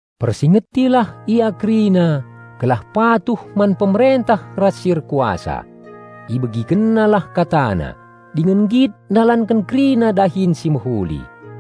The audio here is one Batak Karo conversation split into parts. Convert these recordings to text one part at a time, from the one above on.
Persingetilah ia kerina gelah patuh man pemerentah ras si erkuasa. Ibegikennalah katana, dingen nggit ndalanken kerina dahin si mehuli.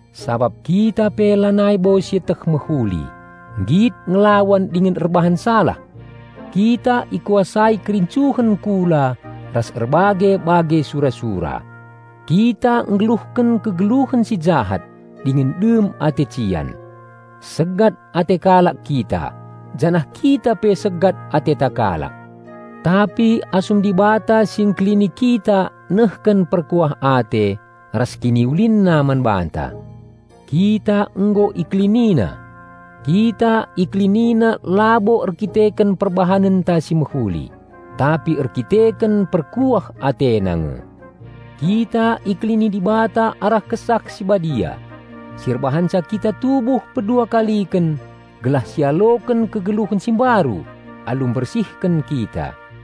Sabap kita pe nai labo sieteh mehuli, nggit ngelawan dingen erbahan salah. Kita ikuasai kerincuhen kula ras erbage-bage sura-sura. Kita nggeluhken kegeluhen si jahat dingen dem ate cian. Segat ate kalak kita, janah kita pe segat ateta kalak. Tapi asum Dibata si Engkelini kita nehken perkuah ate ras KiniulinNa man banta, kita nggo IkeliniNa. Kita IkeliniNa labo erdandanken perbahanenta si mehuli, tapi erdandanken perkuah AteNa nge. Kita ikelini Dibata arah Kesah Si Badia si erbanca kita tubuh peduakaliken gelah sialoken kegeluhen si mbaru alu mbersihken kita.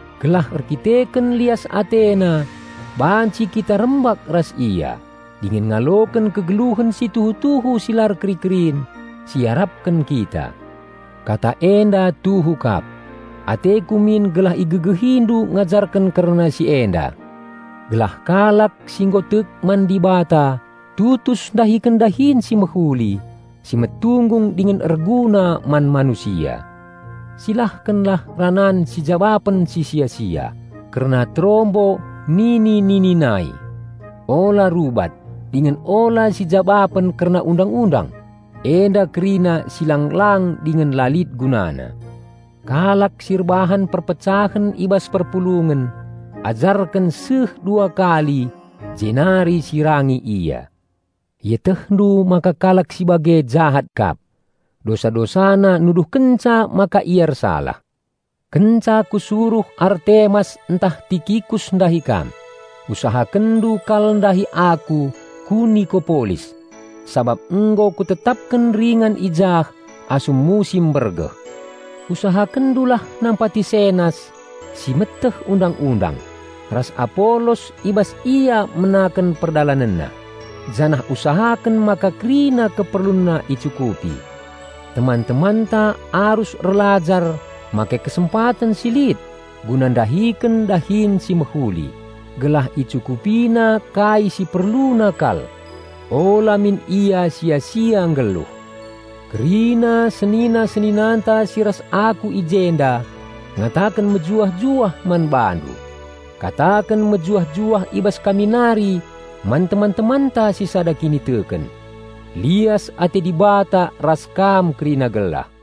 gelah erdandanken lias AteNa banci kita rembak ras Ia dingen ngaloken kegeluhen si tuhu-tuhu si la erkeri-kerin, si iarapken kita. Kata enda tuhu kap. Ateku min gelah igegehindu ngajarken kerna si enda, gelah kalak si nggo tek man Dibata tutus ndahiken dahin si mehuli, si metunggung dingen erguna man manusia. Silahkenlah ranan sijabapen si sia-sia, kerna terombo nini-nini nai, ula rubat, dingen ula sijabapen kerna Undang-undang. Enda kerina si lang-lang dingen la lit gunana. Kalak si erbahan perpecahen i bas perpulungen ajarken ula kurang dua kali jenari sirangi ia. Ietehndu maka kalak si bage jahat kap. Dosa-dosana nuduhkenca maka ia ersalah. Kenca kusuruh Artemas ntah Tikikus ndahi kam, usahakenndu kal ndahi aku ku Nikopolis, sabap nggo kutetapken ringan i jah asum musim mbergeh. Usahakenndulah nampati Senas, si meteh undang-undang, ras Apolos i bas ia menaken perdalanenna, janah usahaken maka kerina keperlunna icukupi. Teman-temanta arus erlajar make kesempaten si lit guna ndahiken dahin si mehuli, gelah icukupina kai si perluna kal. Ula min ia sia-sia nggeluh. Kerina senina-seninanta si ras aku i jenda ngataken mejuah-juah man bandu. Kataken mejuah-juah i bas kami nari man teman-temanta si sada kiniteken. Lias ate Dibata ras kam kerina gelah.